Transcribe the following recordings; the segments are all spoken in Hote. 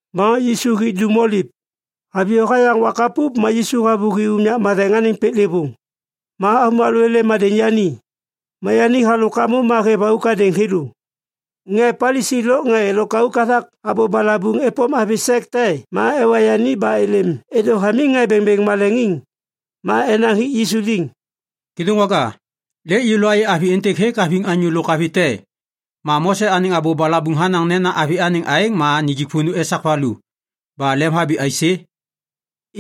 Ma Yisu hi Dum Oliv. Haviyô hayaŋ wak hapup ma Yisu havôhi unyak matheŋ anêŋ piklêvôŋ. Ma avômalô êlêm êdêŋ yani, ma yani halôk hamô ma hêv auk hadêŋ thêlô. Ŋê Palisi lôk ŋê lôkauk hathak abô balabuŋ êpôm avi sek te ma ewa yani ba êlêm êdô hamiŋ ŋê bêŋbêŋ maleŋiŋ. Ma enaŋ hik Yisu liŋ, “Kêdôŋwaga, lêk yêlô ayê avi êntêk hêk haviŋ anyô lôk avi te. Ma Mose anêŋ abô balabuŋ hanaŋ nena avi anêŋ aêŋ ma nijik vônô esak valu. Ba lemhabi aisê?”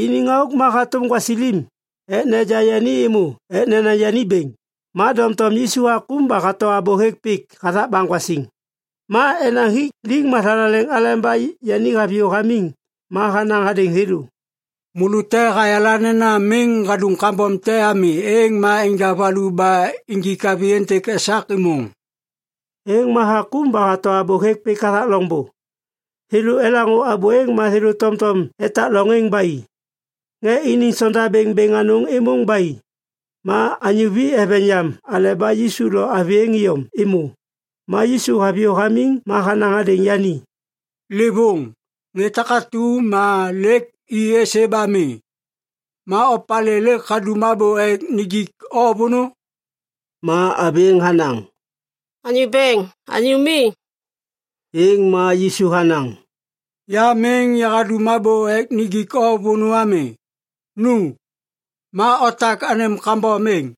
Iniŋ auk êŋ ma hatôm gwasilim ek neja yani êmô ek nenaŋ yani bêŋ. Ma doŋtom Yisu hakôm ba hato abô hêk pik hathak baŋgwasiŋ. Ma enaŋ hik liŋ mathalaleŋ aleba yani haviyô hamiŋ ma hanaŋ hadêŋ thêlô, “Môlô te hayala nena miŋ hadum kambom te ami êŋ ma enja valu ba injik avi êntêk esak êmôŋ.” Êŋ ma hakôm ba hato abô hêk pik hathak loŋbô. Thêlô elaŋô abô êŋ ma thêlô tomtom etak loŋ êŋ ba i. Ŋê iniŋ sondabêŋ bêŋ anôŋ êmôŋ ba i. Ma anyô vi eveŋ yam aleba Yisu lo avi êŋ iyom êmô. Ma Yisu haviyô hamiŋ ma hanaŋ hadêŋ yani, “Livôŋ, ŋê takatu ma lêk i êsê ba mi? Ma opalê lêk hadum abô ek nijik o vônô?” Ma avi êŋ hanaŋ, “Anyô Bêŋ, anyô mi.” Êŋ ma Yisu hanaŋ, “Ya miŋ yahadum abô ek nijik o vônô ami. Nu! Ma otak anêm kambom êŋ!”]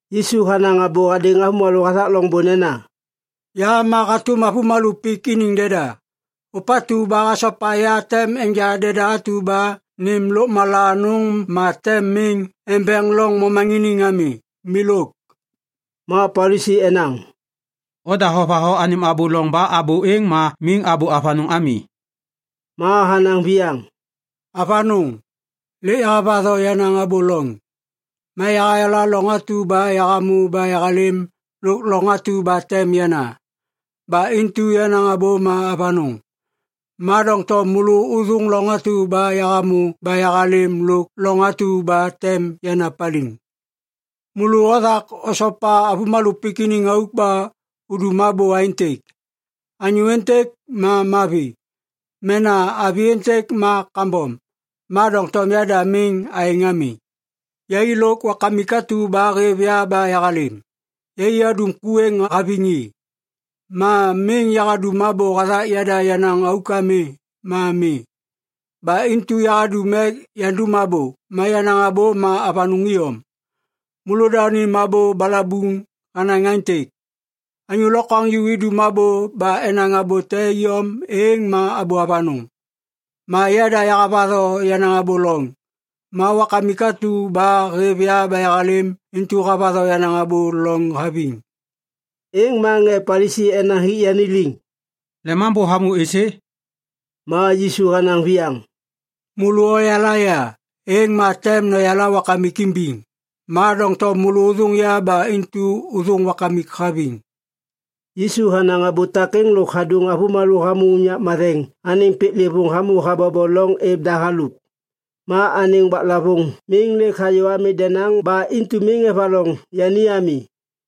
Yisu hanaŋ abô hadêŋ avômalô hathak loŋbô nena, “Ya ma hatôm avômalô pik iniŋ deda. Ôpatu ba hasopa ya tem enja deda atu ba nêm lôkmala anôŋ ma tem miŋ embeŋ loŋ momaŋiniŋ ami. Milôk.” Ma Palisi enaŋ, “Oda hovatho anêm abô loŋ ba abô êŋ ma miŋ abô avanôŋ ami.” Ma hanaŋ viyaŋ, “Avanôŋ, lêk yahavatho yenaŋ abô loŋ. Ma yahayala loŋ atu ba yahamô ba yahalêm lôk loŋ atu ba tem yana. Ba intu yenaŋ abô ma avanôŋ. Ma doŋtom môlô ôthôŋ loŋ atu ba yahamô ba yahalêm lôk loŋ atu ba tem yana paliŋ. Môlô othak osopa avômalô pik iniŋ auk ba udum abô aêntêk, ‘anyô êntêk ma mavi’ mena ‘avi êntêk ma kambom’. Ma doŋtom yada miŋ aêŋ ami. Yai lôk Wakamik atu ba hêv ya ba yahalêm, yai adum ku êŋ haviŋ i. Ma miŋ yahadum abô hathak yada yenaŋ auk ami ma mi. Ba intu yahadum ek yandum abô, ma yenaŋ abô ma avanôŋ iyom. Môlôda unim abô balabuŋ hanaŋ aêntêk, ‘Anyô lokwaŋju idum abô ba enaŋ abô te iyom êŋ ma abô avanôŋ.’ Ma yada yahavatho yenaŋ abô loŋ. Ma Wakamik atu ba hêv ya ba yahalêm intu havatho yenaŋ abô loŋ haviŋ.” Êŋ ma ŋê Palisi enaŋ hik yani liŋ, “Lemambô hamô êsê?” Ma Yisu hanaŋ viyaŋ, “Môlô oyala ya, êŋ ma tem noyala Wakamik imbiŋ. Ma doŋtom môlô ôthôŋ ya ba intu ôthôŋ Wakamik haviŋ.” Yisu hanaŋ abô takêŋ lôk hadôŋ avômalô hamô unyak matheŋ anêŋ piklêvôŋ hamô habobo loŋ êv da halôk. Ma anêŋ waklavôŋ miŋ lêk hayô ami denaŋ ba intu miŋ evaloŋ yani ami.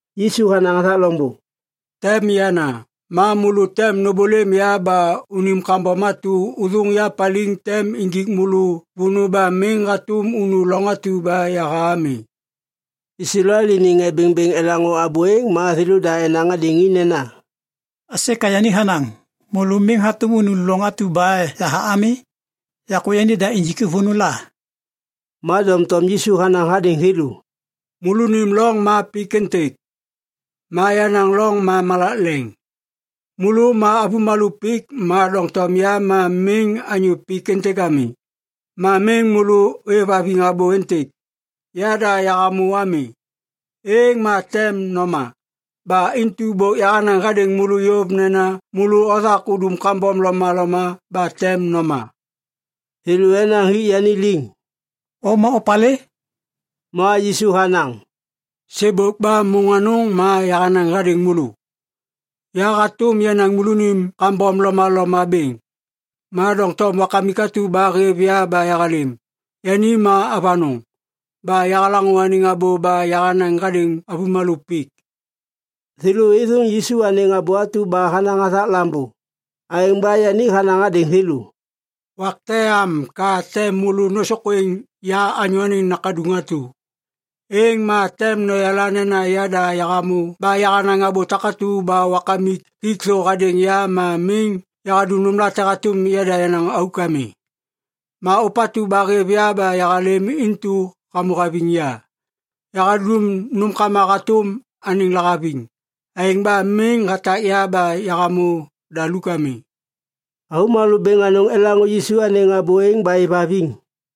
Yisu hanaŋ hathak loŋbô. “Tem yana. Ma môlô tem nômbôlêm ya ba unim kambom atu ôthôŋ ya paliŋ tem injik môlô vônô ba miŋ hatôm unu loŋ atu ba yaha ami.” Islael iniŋ ŋê bêŋbêŋ elaŋô abô êŋ ma thêlôda enaŋ hadêŋ i nena, “Aisê ka yani hanaŋ, ‘Môlô miŋ hatôm unu loŋ atu ba yaha ami’? Yakô yanida injik i vônô la?” Ma doŋtom Yisu hanaŋ hadêŋ thêlô, “Môlônim loŋ ma pik êntêk. Ma yenaŋ loŋ ma malak leŋ. Môlô ma avômalô pik ma doŋtom ya ma miŋ anyô pik êntêk ami. Ma miŋ môlô ôêvhaviŋ abô êntêk ‘Yada Yahamô’ ami, êŋ ma tem noma. Ba intu bôk yahanaŋ hadêŋ môlô yôv nena môlô othak udum kambom lomaloma ba tem noma.” Thêlô enaŋ hik yani liŋ, “O ma opalê?” Ma Yisu hanaŋ, “Sêbôk ba môŋ anôŋ ma yahanaŋ hadêŋ môlô. Yahatôm yanaŋ môlônim kambom lomaloma bêŋ. Ma doŋtom Wakamik atu ba hêv ya ba yahalêm, yani ma avanôŋ. Ba yahalaŋô anêŋ abô ba yahanaŋ hadêŋ avômalô pik.” Thêlô êthôŋ Yisu anêŋ abô atu ba hanaŋ hathak Lambô. Aêŋ ba yani hanaŋ hadêŋ thêlô, “Wak te am ka tem môlô nôsôkwêŋ ya Anyô Anêŋ Nakaduŋ atu. Êŋ ma tem noyala nena Yada Yahamô ba yahanaŋ abô takatu ba Wakamik hik thô hadêŋ ya ma miŋ yahadum nômlate hatôm yada yenaŋ auk ami. Ma ôpatu ba hêv ya ba yahalêm intu hamô haviŋ ya. Yahadum nômkama hatôm anêŋ lahaviŋ. Aêŋ ba miŋ hatak ya ba yahamô daluk ami.” Avômalô bêŋ anôŋ elaŋô Yisu anêŋ abô êŋ ba êvhaviŋ.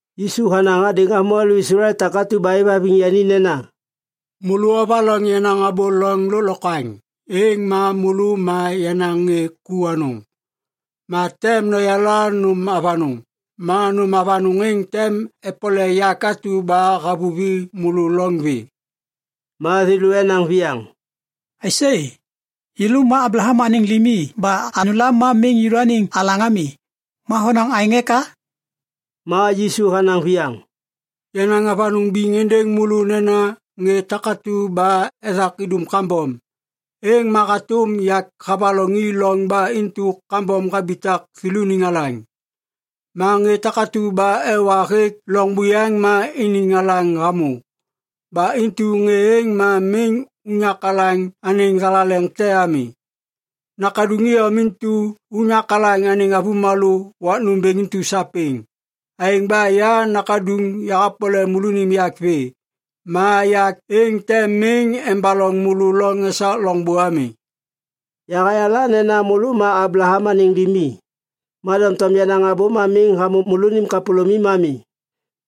Yisu hanaŋ hadêŋ avômalô Islael takatu ba êvhaviŋ yani nena, “Môlô ovaloŋ yenaŋ abô loŋ lôklokwaŋ, êŋ ma môlô ma yenaŋ ŋê ku anôŋ. Ma tem noyala nôm avanôŋ. Ma nôm avanôŋ êŋ tem epole yak atu ba havuvi môlô loŋ vê.” Ma thêlô enaŋ viyaŋ, “Aisê! Yêlô ma Ablaham anêŋ limi ba anyôla ma miŋ yêlôaniŋ alaŋ ami. Ma honaŋ aêŋ eka?” Ma Yisu hanaŋ viyaŋ, “Yanaŋ avanôŋ biŋ êndêŋ môlô nena ŋê takatu ba ethak idum kambom, êŋ ma hatôm yak havaloŋ i loŋ ba intu kambom habitak thêlôniŋ alaŋ. Ma ŋê takatu ba ewa hêk loŋ buyaŋ ma iniŋ alaŋ hamô. Ba intu ŋê êŋ ma miŋ unyak alaŋ anêŋ thalaleŋ te ami. Nakaduŋ iyom intu unyak alaŋ anêŋ avômalô wak nômbêŋ intu sapêŋ. Aêŋ ba ya Nakaduŋ yahapole môlônim yak vê, ma yak êŋ tem miŋ embaloŋ môlô loŋ esak loŋbô ami. Yahayala nena môlô ma Ablaham anêŋ limi, ma doŋtom yenaŋ abô ma miŋ hamô môlônim kapôlômim ami.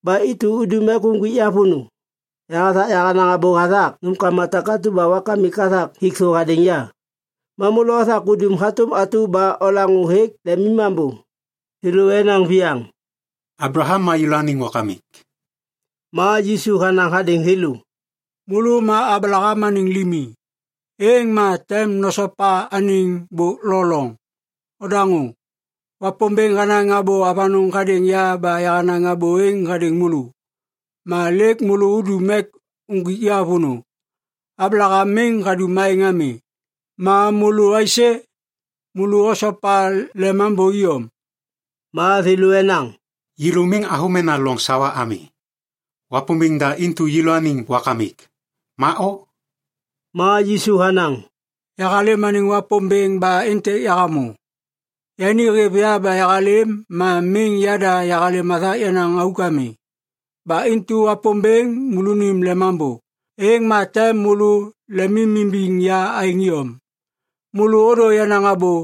Ba intu udum ek uŋgwik ya vônô. Yahathak yahanaŋ abô hathak nômkama takatu ba Wakamik hathak hik thô hadêŋ ya. Ma môlô othak udum hatôm atu ba olaŋô hêk lemimambô.” Thêlô enaŋ viyaŋ, “Ablaham ma yêlôaniŋ wakamik.” Ma Yisu hanaŋ hadêŋ thêlô, “Môlô ma Ablaham anêŋ limi, êŋ ma tem nosopa anêŋ bôk lo loŋ. Odaŋô! Wapômbêŋ hanaŋ abô avanôŋ hadêŋ ya ba yahanaŋ abô êŋ hadêŋ môlô. Ma lêk môlô udum ek uŋgwik ya vônô! Ablaham miŋ hadum aêŋ ami. Ma môlô aisê? Môlô osopa lemambô iyom.” Ma thêlô enaŋ, “Yêlô miŋ avômena loŋ sawa ami. Wapômbêŋ da intu yêlôaniŋ wakamik. Ma o?” Ma Yisu hanaŋ, “Yahalêm anêŋ Wapômbêŋ ba êntêk yahamô. Yani hêv ya ba yahalêm ma miŋ yada yahalêm hathak yenaŋ auk ami. Ba intu Wapômbêŋ môlônim Lemambô, êŋ ma tem môlô lemimimbiŋ ya aêŋ iyom. Môlô ôdô yenaŋ abô.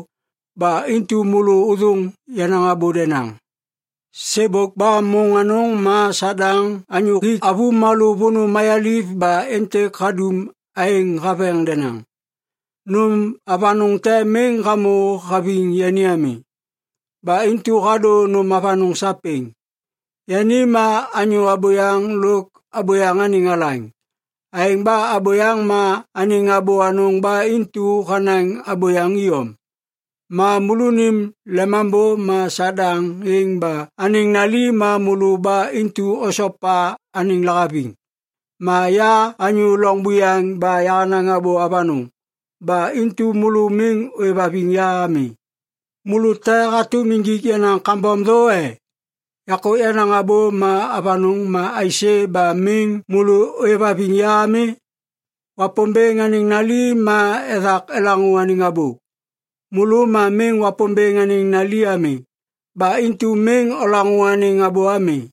Ba intu môlô ôthôŋ yenaŋ abô denaŋ. Sêbôk ba môŋ anôŋ ma Sadaŋ anyô hik avômalô vônô mayaliv ba êntêk hadum aêŋ haveŋ denaŋ. Nôm avanôŋ te miŋ hamô haviŋ yani ami. Ba intu hadô nôm avanôŋ sapêŋ. Yani ma anyô abôyaŋ lôk abôyaŋ anêŋ alaŋ. Aêŋ ba abôyaŋ ma anêŋ abô anôŋ ba intu hanaŋ abôyaŋ iyom. Ma môlônim lemambô ma Sadaŋ êŋ ba anêŋ nali ma môlô ba intu osopa anêŋ lahaviŋ. Ma ya anyô loŋ buyaŋ ba yahanaŋ abô avanôŋ. Ba intu môlô miŋ ôêvhaviŋ ya ami. Môlô te hatôm injik yenaŋ kambom thô e? Yakô yenaŋ abô ma avanôŋ ma aisê ba miŋ môlô ôêvhaviŋ ya ami? Wapômbêŋ anêŋ nali ma ethak elaŋô anêŋ abô. Môlô ma miŋ Wapômbêŋ anêŋ nali ami. Ba intu miŋ olaŋô anêŋ abô ami.”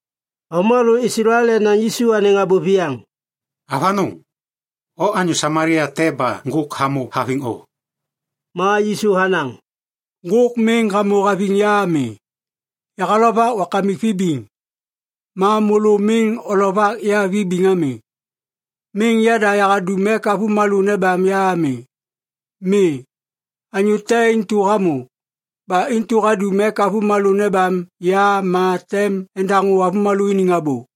Avômalô Islael enaŋ Yisu anêŋ abô viyaŋ, “Avanôŋ! O anyô Samalia te ba ŋgôk hamô haviŋ o!” Ma Yisu hanaŋ, “Ŋgôk miŋ hamô haviŋ ya ami. Yahalovak Wakamik vibiŋ. Ma môlô miŋ olovak ya vibiŋ ami. Miŋ yada yahadum ek avômalô nebam ya ami. Mi. Anyô te intu hamô. Ba intu hadum ek avômalô nebam ya ma tem endaŋô avômalô iniŋ abô.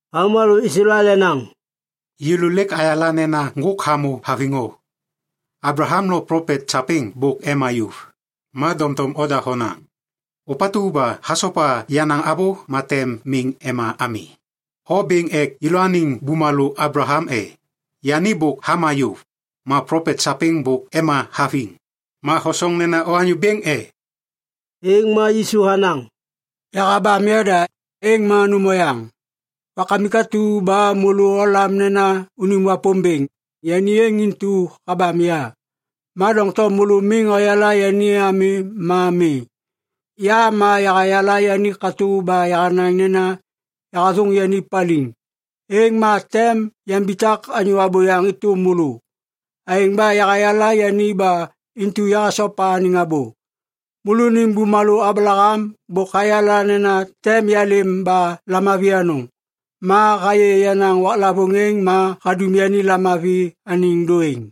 Avômalô Islael enaŋ, “Yêlô lêk ayala nena ŋgôk hamô haviŋ o. Ablaham lôk plopet sapêŋ bôk ema yôv. Ma doŋtom oda honaŋ, ‘Ôpatu ba hasopa yenaŋ abô ma tem miŋ ema ami.’ O bêŋ ek yêlôaniŋ bumalô Ablaham, e? Yani bôk hama yôv! Ma plopet sapêŋ bôk ema haviŋ. Ma hosoŋ nena o anyô bêŋ e?” Êŋ ma Yisu hanaŋ, “Yahabam yada, êŋ ma nôm oyaŋ. Wakamik atu ba môlô olam nena unim Wapômbêŋ, yani êŋ intu habam ya. Ma doŋtom môlô miŋ oyala yani ami ma mi. Ya ma yahayala yani katô ba yahanaŋ nena yahathôŋ yani paliŋ, êŋ ma tem yambitak anyô abôyaŋ êtôm môlô. Aêŋ ba yahayala yani ba intu yahasopa anêŋ abô. Môlônim bumalô Ablaham bôk hayala nena tem yalêm ba lamavi anôŋ. Ma hayê yenaŋ waklavôŋ êŋ ma hadum yani lamavi anêŋ dôêŋ.”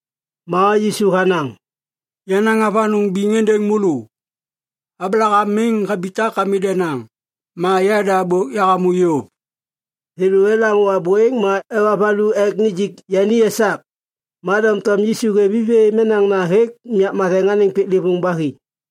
Ma Yisu hanaŋ, “Yanaŋ avanôŋ biŋ êndêŋ môlô. Ablaham miŋ habitak ami denaŋ, ma yada bôk yahamô yôv.” Thêlô elaŋô abô êŋ ma ewa valu ek nijik yani esak. Ma doŋtom Yisu hêv i vê menaŋna hêk unyak matheŋ anêŋ piklêvôŋ ba hi.